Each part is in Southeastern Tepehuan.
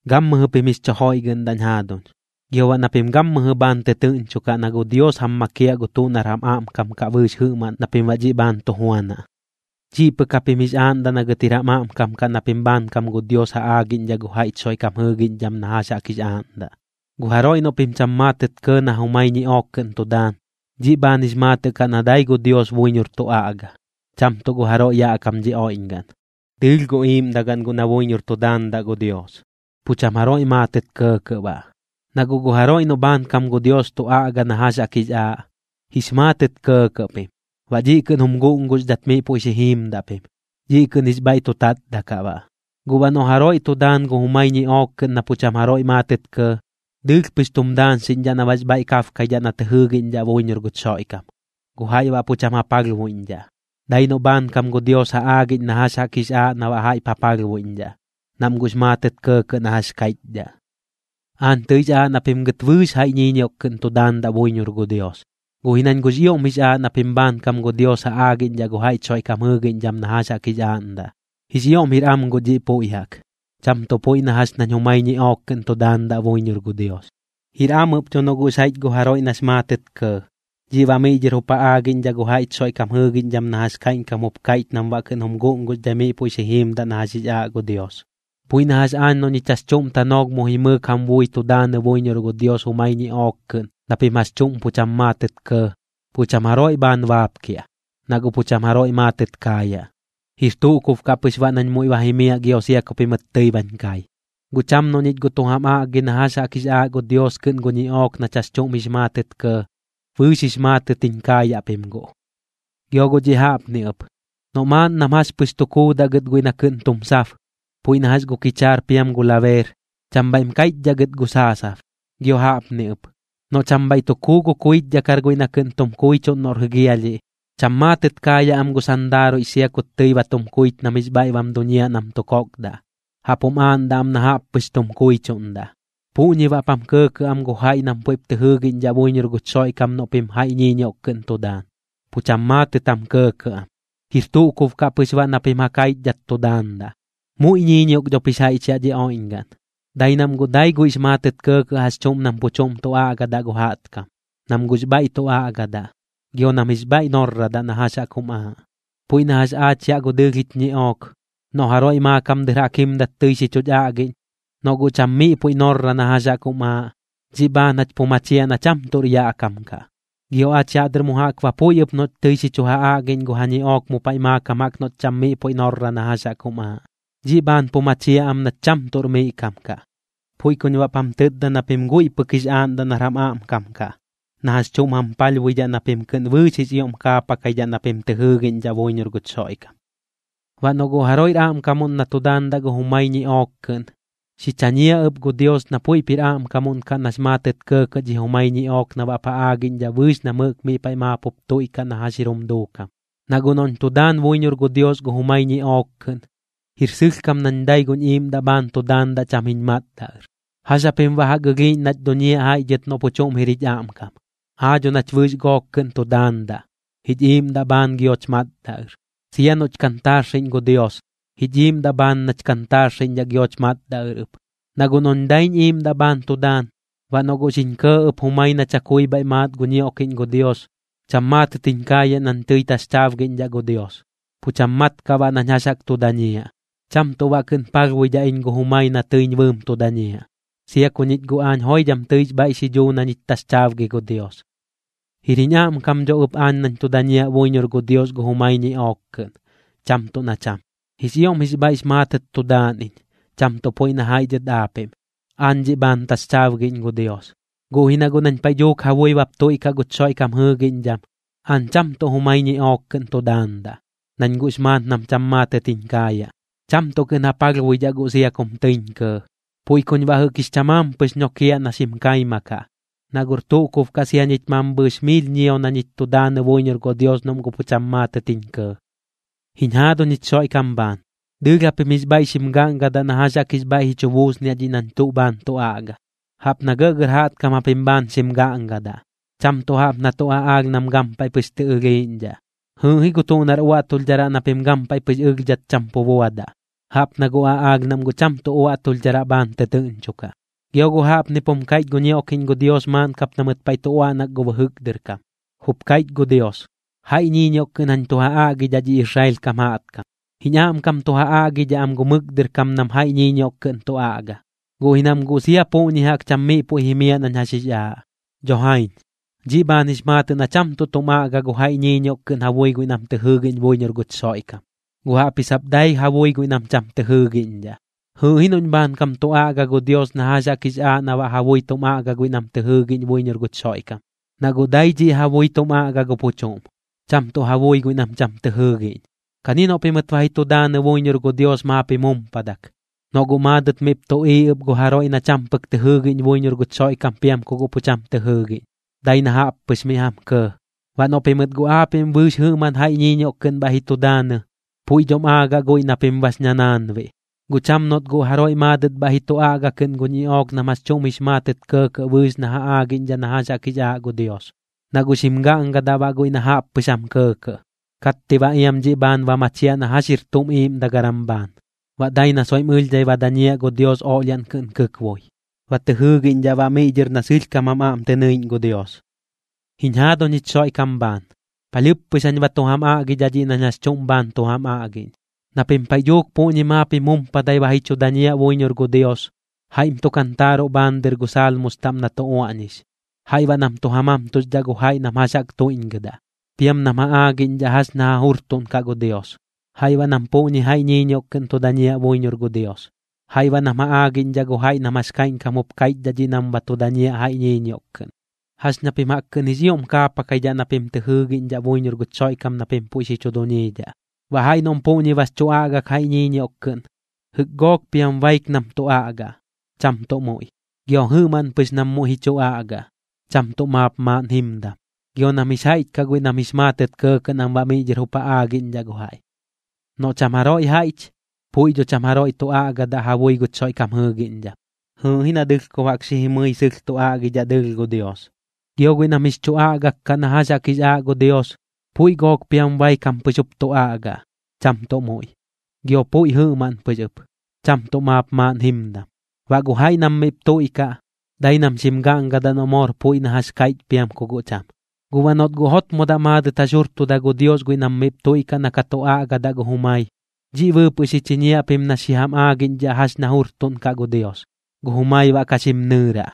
Gammɨjɨ pim jix chu joiꞌgɨꞌndaꞌñ jaaduñ, gio baꞌ na pim gammɨjɨ bhaan tɨtɨɨꞌñchokaꞌ na gu Dios jam makiaꞌ gu tuꞌ nar jam aꞌmkam kaꞌ bɨɨx jɨꞌmaꞌn na pim baꞌ dhiꞌ bhaan tu juanaꞌ. Dhiꞌ pɨk japim jix aaꞌndaꞌ na gɨt jir jam aꞌmkam kaꞌ na pim bhaankam gu Dios ja aagiꞌñdhaꞌ gu jaiꞌch Xoiꞌkam jɨɨgiꞌñdham na jax jaꞌk jix aaꞌndaꞌ. Gu jaroiꞌ noꞌ pim cham maatɨt kɇɇ na jumai ñiꞌook kɨꞌn tu daan, dhiꞌ bhaan jix maatɨꞌ kaꞌ na dai gu Dios buiñor tu aꞌga, cham tuꞌ gu jaroiꞌ yaꞌ kam dhi oiꞌñgaꞌn. Dɨɨlh gu iiꞌmdagaꞌn guꞌ na buiñor tu daandaꞌ gu Dios, pu cham jaroiꞌ maatɨt kɇɇkɇꞌ baꞌ. Na guꞌ gu jaroiꞌ noꞌ bhaankam gu Dios tu aꞌga na jax jaꞌk jix aaꞌ, jix maatɨt kɇɇkɇꞌ pim, baꞌ dhiꞌ kɨꞌn jum guꞌnguxdhat miꞌ puiꞌ xi jiimdaꞌ pim, dhiꞌ kɨꞌn jix bhaiꞌ tu tatdaꞌ kaꞌ baꞌ. Guꞌ baꞌ noꞌ jaroiꞌ tu daan gu jumai ñiꞌook kɨꞌn na pu cham jaroiꞌ maatɨt kɇɇ, dɨɨlh pɨx tum daañxiꞌñdhaꞌ na baꞌx bhaiꞌ kabkaidhaꞌ na tɨ jɨɨgiꞌñdhaꞌ buiñor guch Xoiꞌkam, gu jaiꞌ baꞌ pu cham ja palhbuiꞌñdhaꞌ. Dai noꞌ bhaankam gu Dios ja aagiꞌñ na jax jaꞌk jix aaꞌ na baꞌ jaiꞌp ja palhbuiꞌñdhaꞌ, nam guꞌx maatɨt kɇɇkɇꞌ na jax kaiꞌchdhaꞌ. Aañ tɨix aaꞌ na pim gɨt bɨɨx jaiꞌ ñiiñioꞌk kɨꞌn tu daandaꞌ buiñor gu Dios, guꞌ ji nañ guꞌx ioꞌm jix aaꞌ na pim bhaankam gu Dios ja aagiꞌñdhaꞌ gu jaiꞌch Xoiꞌkam jɨɨgiꞌñdham na jax jaꞌk jix aaꞌndaꞌ. Jix ioꞌm jir am guꞌ dhiꞌ puiꞌ jaꞌk, cham tuꞌ puiꞌ na jax nañ jumai ñiꞌook kɨꞌn tu daandaꞌ buiñor gu Dios. Jir am ɨp dho noꞌ guꞌx jaiꞌch gu jaroiꞌ nax maatɨt kɇɇ, dhiꞌ baꞌ miꞌ dhɨr jup ja aagiꞌñdhaꞌ gu jaiꞌch Xoiꞌkam jɨɨgiꞌñdham na jax kaiꞌñkam jup kaiꞌch nam baꞌ kɨꞌn jum guꞌnguxdhai miꞌ puiꞌ xi jiimdaꞌ na jax jix aaꞌ gu Dios. Puiꞌ na jax aañ noꞌ ñich jax chuꞌm tanoolh mu jimɨɨk jam bui tu daanɨ buiñor gu Dios jumai ñiꞌook kɨꞌn na pim jax chuꞌm pu cham maatɨt kɇɇ, pu cham jaroiꞌ bhaan baapkiaꞌ, na guꞌ pu cham jaroiꞌ maatɨt kaayaꞌ. Jir tuꞌ kub kaꞌ pɨx baꞌ nañ muiꞌ ba jimiaꞌ gio sia ku pimɨt tɨi bañ kai. Guꞌ cham noꞌ ñich guꞌ tu jam aꞌgi na jax jaꞌk jix aaꞌ gu Dios kɨꞌn gu ñiꞌook nach jax chuꞌm jix maatɨt kɇɇ, bɨɨx jix maatɨt jiñ kaayaꞌ pim guꞌ. Gio guꞌ dhiꞌ jaꞌpni ɨp, noꞌ maaꞌn nam jax pɨx tu kuudaꞌ gɨt guiꞌ na kɨꞌn tum sab, puiꞌ na jax gu kichaar piam gu labeer, cham bhaiꞌm kaiꞌchdhaꞌ gɨt gu saasab. Gio jaꞌpni ɨp, noꞌ cham bhaiꞌ tu kuu gu kuichdhakar guiꞌ na kɨꞌn tum kuichuꞌn noꞌr jɨgialhiꞌ, cham maatɨt kaayaꞌ am gu sandaaruiꞌx sia kut tɨi ba tum kuich nam jix bhaiꞌ bam duñiaꞌ nam tu kokdaꞌ, jaꞌp jum aaꞌndaꞌ am na jaꞌp pɨx tum kuichuꞌndaꞌ. Puꞌñi baꞌp jam kɇɇkɇꞌ am gu jaiꞌ nam puiꞌp tɨ jɨɨgiꞌñdhaꞌ buiñor guch Xoiꞌkam noꞌ pim jaiꞌ ñiiñioꞌk kɨꞌn tu daan, pu cham maatɨt jam kɇɇkɇꞌ am, jir tuꞌ kub kaꞌ pɨx baꞌ na pim ja kaichdhat tu daandaꞌ. Muiꞌ ñiiñioꞌk dhop jix jaiꞌch yaꞌ dhi oiꞌñgaꞌn, dai nam guꞌ dai guiꞌx maatɨt kɇɇkɇꞌ jax chuꞌm nam pu chuꞌm tu aꞌgadaꞌ gu jaꞌtkam, nam guꞌx bhaiꞌ tu aꞌgadaꞌ, gio nam jix bhaiꞌ norradaꞌ na jax jaꞌk jum aaꞌ. Puiꞌ na jax aach yaꞌ gu dɨɨlh jich ñiꞌook, noꞌ jaroiꞌ maakam dɨr jaꞌk jimdat tɨi xi chuch aꞌgiꞌñ, noꞌ guꞌ cham miꞌ puiꞌ norra na jax jaꞌk jum aaꞌ, dhiꞌ bhaan jach pu machiaꞌ na cham tuꞌr yaꞌ kam kaꞌ. Gio aach yaꞌ dɨr mu jaꞌk ba puiꞌ ɨp noꞌch tɨi xi chu ja aꞌgiꞌñ kɨꞌn gu ja ñiꞌook mu paiꞌ maakam jaꞌk noꞌch cham miꞌ puiꞌ norra na jaꞌk jum aaꞌ, dhiꞌ bhaan pu machiaꞌ am nach cham tuꞌr miꞌ kam kaꞌ. Puiꞌ kuñ baꞌp jam tɨtda na pim guiꞌ pɨk jix aaꞌndaꞌ nar jam aꞌmkam kaꞌ, na jax chuꞌm jam palhbuidhaꞌ na pim kɨꞌn bɨɨx jix ioꞌm kaapakaidhaꞌ na pim tɨ jɨɨgiꞌñdhaꞌ buiñor guch Xoiꞌkam. Baꞌ noꞌ guꞌ jaroiꞌr aꞌmkamuꞌn na tu daandaꞌ gu jumai ñiꞌook kɨꞌn, xi chañiaꞌ ɨp gu Dios na puiꞌp jir aꞌmkamuꞌn kaꞌ nax maatɨt kɇɇkɇꞌ dhi jumai ñiꞌook na baꞌp ja aagiꞌñdhaꞌ bɨɨx nam jɨꞌk miꞌ paiꞌ maap jup tuiꞌkaꞌ na jax jir jum duukam. Na guꞌ noꞌñ tu daan buiñor gu Dios gu jumai ñiꞌook kɨꞌn, jir sɨlhkam nañ dai guñ iiꞌmdaꞌ bhaan tu daandaꞌ cham jiñ matdaꞌ ɨr. ¿Jax japim baꞌ jaꞌk ɨlhiiꞌñ nach duñiaꞌ jaiꞌ dhɨt noꞌ pu chuꞌm jir jich aꞌmkam? Aa dho nach bɨɨx gook kɨꞌn tu daandaꞌ, jich iiꞌmdaꞌ bhaan gioch matdaꞌ ɨr. Sia noꞌch kantaarxiꞌñ gu Dios, jich iiꞌmdaꞌ bhaan nach kantaarxiꞌñdhaꞌ gioch matdaꞌ ɨr ɨp. Na guꞌ noꞌñ daiñ iiꞌmdaꞌ bhaan tu daan, baꞌ noꞌ guꞌ xiñ kɇɇ ɨp jumai na chakui bhaiꞌ maat gu ñioꞌkiꞌñ gu Dios, cham maatɨt jiñ kaayaꞌ nañ tɨi taxchaabgiꞌñdhaꞌ gu Dios, pu cham mat kaꞌ baꞌ nañ jax jaꞌk tu dañiaꞌ. Cham tuꞌ baꞌ tuꞌ kɨꞌn palhbuidhaꞌ iñ gu jumai na tɨiñ bɨɨm tu dañiaꞌ, sia ku ñich guꞌ aañ joidham tɨix bhaiꞌ xi dhuu na ñich taxchaabgi gu Dios. Jir jiñ aꞌmkam dho ɨp aañ nañ tu dañiaꞌ buiñor gu Dios gu jumai ñiꞌook kɨꞌn, cham tuꞌ na cham. Jix ioꞌm jix bhaiꞌx maatɨt tu daan iñ, cham tuꞌ puiꞌ na jaiꞌ dhɨt aapiꞌm. Aañ dhiꞌ bhaan taxchaabgiꞌñ gu Dios. Guꞌ ji na guꞌ nañ paiꞌ dhuuk ja bui bap tuiꞌkaꞌ guch Xoiꞌkam jɨɨgiꞌñdham, aañ cham tuꞌ jumai ñiꞌook kɨꞌn tu daandaꞌ, nañ guꞌx maat nam cham maatɨt jiñ kaayaꞌ, cham tuꞌ kɨꞌn ja palhbuidhaꞌ guꞌ sia kum tɨiñ kɇɇ. Puiꞌ kuñ baꞌ jɨꞌk jix chamaam pɨx ñokiaꞌ na xim kaima kaꞌ, na guꞌr tuꞌ kub kaꞌ sia ñich mambhɨɨx miil ñio na ñich tu daanɨ buiñor gu Dios noꞌm guꞌ pu cham maatɨt jiñ kɇɇ. Jiñ jaaduñ jich Xoiꞌkam bhaan, dɨɨlh japim jix bhaiꞌ xim gaꞌngadaꞌ na jax jaꞌk jix bhaiꞌ ji chu buusniaꞌ dhiꞌ nañ tuꞌ bhaan tu aꞌga. Jaꞌp na gɇꞌgɇr jaꞌtkam japim bhaan xim gaꞌngadaꞌ, cham tuꞌ jaꞌp na tuꞌ aꞌaalh nam gampaiꞌ pɨx tɨ ɨlhiiꞌñdhaꞌ. Jɨɨꞌ ji gu tuꞌ nar uaꞌtulhdharaꞌ na pim gampaiꞌ pɨx ɨlhdhat cham pu buadaꞌ, jaꞌp na gu aꞌaalh nam guꞌ cham tuꞌ uaꞌtulhdharaꞌ bhaan tɨtɨɨꞌñchokaꞌ. Gio guꞌ jaꞌpnip jum kaiꞌch gu ñioꞌkiꞌñ gu Dios maaꞌn kap na mɨt paiꞌ tu uaꞌnak gu bɨjɨk dɨr kam: “Jup kaiꞌch gu Dios: Jaiꞌ ñiiñioꞌk kɨꞌn jañ tu ja aꞌgidhaꞌ dhi Israel kam jaꞌtkam, jiñ aꞌmkam tu ja aꞌgidhaꞌ am gu mɨk dɨr kam nam jaiꞌ ñiiñioꞌk kɨꞌn tu aꞌga, guꞌ ji nam guꞌ sia puꞌñi jaꞌk cham miꞌ puiꞌ jimiaꞌ nañ jax jix aaꞌ.” Dho jaiñ, dhiꞌ bhaan jix maatɨꞌ na cham tuꞌ tum aꞌga gu jaiꞌ ñiiñioꞌk kɨꞌn ja bui guiꞌ nam tɨ jɨɨgiꞌñ buiñor guch Xoiꞌkam, guꞌ jaꞌpji sap dai ja bui guiꞌ nam cham tɨ jɨɨgiꞌñdhaꞌ. Jɨɨꞌ ji noꞌñ bhaankam tu aꞌga gu Dios na jax jaꞌk jix aaꞌ na baꞌ ja bui tum aꞌga guiꞌ nam tɨ jɨɨgiꞌñ buiñor guch Xoiꞌkam, na guꞌ dai dhiꞌ ja bui tum aꞌga gu pu chuꞌm, cham tuꞌ ja bui guiꞌ nam cham tɨ jɨɨgiꞌñ. Kani noꞌ pimɨt ba ji tu daanɨ buiñor gu Dios maap jim jumpadak, noꞌ guꞌ maadɨt miꞌp tuꞌiiꞌ ɨp gu jaroiꞌ na cham pɨk tɨ jɨɨgiꞌñ buiñor guch Xoiꞌkam piam ku guꞌ pu cham tɨ jɨɨgiꞌñ, dai na jaꞌp pɨx miꞌ jam kɇɇ. Baꞌ noꞌ pimɨt guꞌ aapiꞌm bɨɨx jɨꞌmaꞌn jaiꞌ ñiiñioꞌk kɨꞌn bhaiꞌ ji tu daanɨ, puiꞌ dhom aagaꞌ guiꞌ na pim bax ñanaanbiꞌ. Guꞌ cham noꞌt guꞌ jaroiꞌ maadɨt bhaiꞌ ji chu aꞌga kɨꞌn gu ñiꞌook nam jax chuꞌm jix maatɨt kɇɇkɇꞌ bɨɨx na ja aagiꞌñdhaꞌ na jax jaꞌk jix aaꞌ gu Dios, na guꞌ xim gaꞌngadaꞌ baꞌ guiꞌ na jaꞌp pɨx jam kɇɇkɇꞌ. Katti baꞌ iam dhiꞌ bhaan ba machiaꞌ na jax jir tuꞌm iiꞌmdagaram bhaan, baꞌ dai na soiꞌm ɨlhdhai ba dañiaꞌ gu Dios oꞌlhiaꞌn kɨꞌn kɨkboi, ba tɨ jɨɨgiꞌñdhaꞌ baꞌ miꞌ dhɨr na sɨlhkam jam aꞌm tɨ nɨiꞌñ gu Dios. Jiñ jaaduñ jich Xoiꞌkam bhaan, palhɨɨp pɨx jañ ba tu jam aꞌgiꞌñdhaꞌ dhiꞌ nañ jax chuꞌm bhaan tu jam aꞌgiꞌñ. Na pim paiꞌ dhuuk puꞌñi maap jum jumpadai ba ji chu dañiaꞌ buiñor gu Dios, jaiꞌm tu kantaaruꞌ bhaan dɨr gu Saalmus taꞌm na tu uaꞌñix, jaiꞌ ba nam tu ja mamtuxdhaꞌ gu jaiꞌ nam jax jaꞌk tuiꞌñgɨdaꞌ, piam nam ja aagiꞌñdhaꞌ jax ña ja jurtuꞌnkaꞌ gu Dios. Jaiꞌ baꞌ nam puꞌñi jaiꞌ ñiiñioꞌk kɨꞌn tu dañiaꞌ buiñor gu Dios, jaiꞌ baꞌ nam ja aagiꞌñdhaꞌ gu jaiꞌ nam jax kaiꞌñkam jup kaiꞌchdhaꞌ dhiꞌ nam ba tu dañiaꞌ jaiꞌ ñiiñioꞌk kɨꞌn. Jax ña pim jaꞌk kɨꞌn jix ioꞌm kaapakaidhaꞌ na pim tɨ jɨɨgiꞌñdhaꞌ buiñor guch Xoiꞌkam na pim puiꞌ xi chu duñiidhaꞌ. Baꞌ jaiꞌ noꞌm puꞌñi bax chu aꞌgak jaiꞌ ñiiñioꞌk kɨꞌn, jɨꞌk gook piam baik nam tu aꞌgaꞌ, cham tuꞌ muiꞌ. Gio jɨꞌmaꞌn pɨx nam muiꞌ ji chu aꞌgaꞌ, cham tuꞌ maap maaꞌn jimdam. Gio nam jix jaiꞌch kaꞌ guiꞌ nam jix maatɨt ja kɇɇkɇꞌ nam baꞌ miꞌ dhɨr jup ja aagiꞌñdhaꞌ gu jaiꞌ. Noꞌ cham jaroiꞌ jaiꞌch, puiꞌ dho cham jaroiꞌ tu aꞌgadaꞌ ja bui guch Xoiꞌkam jɨɨgiꞌñdham. Jɨɨꞌ ji na dɨlhkob jaꞌk xi jimɨi sɨlh tu aꞌgidhaꞌ dɨɨlh gu Dios. Gio guiꞌ nam jix chu aꞌgak kaꞌ na jax jaꞌk jix aaꞌ gu Dios, puiꞌ gook piam baik jam pɨx jup tu aꞌgaꞌ, cham tuꞌ muiꞌ, gio puiꞌ jɨꞌmaꞌn pɨx ɨp, cham tuꞌ maap maaꞌn jimdam. Baꞌ gu jaiꞌ nam miꞌp tuiꞌkaꞌ, dai nam xim gaꞌngadaꞌ noꞌ moor puiꞌ na jax kaiꞌch piam ku guꞌ cham. Guꞌ baꞌ noꞌt guꞌ jotmodaꞌ maadɨt jax jurtuda gu Dios guiꞌ nam miꞌp tuiꞌkaꞌ na ka tu aꞌgadaꞌ gu jumai, dhiꞌ bɨɨpɨꞌ xi chiñiaꞌ pim na xi jam aagiꞌñdhaꞌ jax ña jurtuꞌn kaꞌ gu Dios, gu jumai baꞌ ka xim nɨɨraꞌ.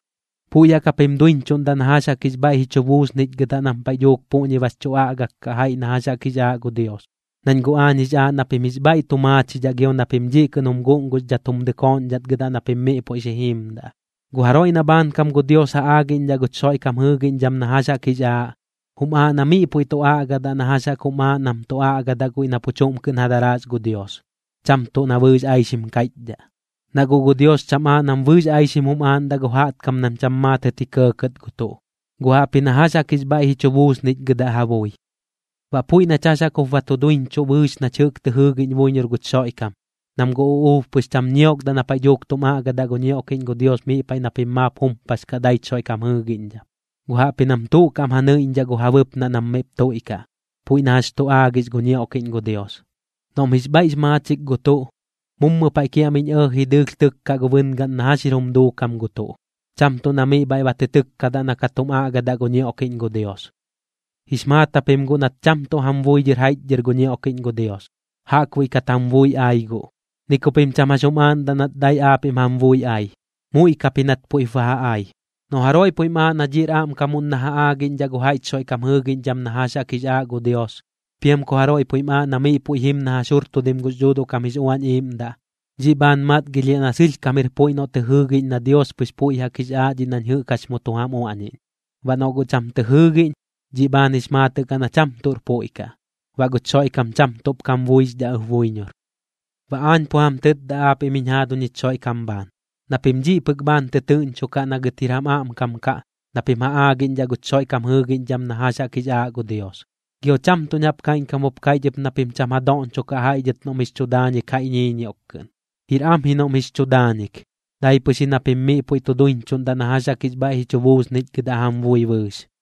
Puiꞌ jaꞌk japim duiñchuꞌndaꞌ na jax jaꞌk jix bhaiꞌ ji chu buusnichgɨdaꞌ nam paiꞌ dhuuk puꞌñi bax chu aꞌgak kaꞌ jaiꞌ na jax jaꞌk jix aaꞌ gu Dios, nañ guꞌ aañ jix aaꞌ na pim jix bhaiꞌ tu maachidhaꞌ gio na pim dhiꞌ kɨꞌn jum guꞌnguxdhat jum dɨkooꞌñdhatgɨdaꞌ na pim miꞌ puiꞌ xi jiimdaꞌ. Gu jaroiꞌ na bhaankam gu Dios ja aagiꞌñdhaꞌ guch Xoiꞌkam jɨɨgiꞌñdham na jax jaꞌk jix aaꞌ, jum aaꞌ na miꞌ puiꞌ tu aꞌgadaꞌ na jax jaꞌk jum aaꞌ nam tu aꞌgadaꞌ guiꞌ na pu chuꞌm kɨꞌn ja daraas gu Dios, cham tuꞌ na bɨɨx aixim kaichdhaꞌ. Na guꞌ gu Dios cham aaꞌ nam bɨɨx aixim jum aaꞌndaꞌ gu jaꞌtkam nam cham maatɨt ji kɇɇkɇt gu tuꞌ, guꞌ jaꞌpji na jax jaꞌk jix bhaiꞌ ji chu buusnichgɨdaꞌ ja bui. Baꞌ puiꞌ nach jax jaꞌk jup ba duiñchuꞌ bɨɨx nach jɨꞌk tɨ jɨɨgiꞌñ buiñor guch Xoiꞌkam, nam gu uꞌuub pɨx cham ñiokdaꞌ na paiꞌ dhuuk tum aꞌgadaꞌ gu ñioꞌkiꞌñ gu Dios miꞌ paiꞌ na pim maap jumpax kaꞌ daich Xoiꞌkam jɨɨgiꞌñdham, guꞌ jaꞌpji nam tuꞌ kaꞌm ja nɨiꞌñdhaꞌ gu ja bɨpnaꞌ nam miꞌp tuiꞌkaꞌ, puiꞌ na jax tu aagix gu ñioꞌkiꞌñ gu Dios. Noꞌm jix bhaiꞌx maachik gu tuꞌ, mummɨ paiꞌ kiaꞌmiꞌñ ɇɇji dɨɨlh tɨkkaꞌ gu bɨngaꞌn na jax jir jum duukam gu tuꞌ, cham tuꞌ na miꞌ bhaiꞌ ba tɨ tɨkkadaꞌ na ka tum aꞌgadaꞌ gu ñioꞌkiꞌñ gu Dios. Jix maat japim guꞌ nat cham tuꞌ jam bui dhɨr jaiꞌchdhɨr gu ñioꞌkiꞌñ gu Dios, jaꞌkbuiꞌ kat jam bui ai guꞌ. Ni ku pim cham jax jum aaꞌndaꞌ nat dai aapiꞌm jam bui ai, muiꞌ kap ji nat puiꞌp ba ja ai. Noꞌ jaroiꞌ puiꞌm aaꞌ na dhiꞌr aꞌmkamuꞌn na ja aagiꞌñdhaꞌ gu jaiꞌch Xoiꞌkam jɨɨgiꞌñdham na jax jaꞌk jix aaꞌ gu Dios, piam ku jaroiꞌ puiꞌm aaꞌ na miꞌ puiꞌ jim na jax jurtudim gux Dhuuduꞌ kam jix Uañ Iiꞌmdaꞌ, dhiꞌ bhaan matgilhiaꞌ na sɨlhkam jir puiꞌ noꞌ tɨ jɨɨgiꞌñ na Dios pɨx puiꞌ jaꞌk jix aaꞌ dhiꞌ nañ jɨꞌk jax mu tu jam uaꞌñiꞌñ. Baꞌ noꞌ guꞌ cham tɨ jɨɨgiꞌñ, dhiꞌ bhaan jix maatɨꞌ kaꞌ na cham tuꞌr puiꞌ kaꞌ, baꞌ guch Xoiꞌkam cham tuꞌp kam buixdhaꞌ ɨp buiñor. Baꞌ aañ pu jam tɨtda aapiꞌm jiñ jaaduñ jich Xoiꞌkam bhaan, na pim dhiꞌ pɨk bhaan tɨtɨɨꞌñchokaꞌ na gɨt jir jam aꞌmkam kaꞌ, na pim ja aagiꞌñdhaꞌ guch Xoiꞌkam jɨɨgiꞌñdham na jax jaꞌk jix aaꞌ gu Dios. Gio cham tuꞌñ jaꞌp kaiꞌñkam jup kaiꞌch ɨp na pim cham ja doꞌñchokaꞌ jaiꞌ dhɨt noꞌm jix chu daañik jaiꞌ ñiiñioꞌk kɨꞌn. Jir am ji noꞌm jix chu daañik, dai pɨx ji na pim miꞌ puiꞌ tu duiñchuꞌndaꞌ na jax jaꞌk jix bhaiꞌ ji chu buusnichgɨdaꞌ jam bui bɨɨx.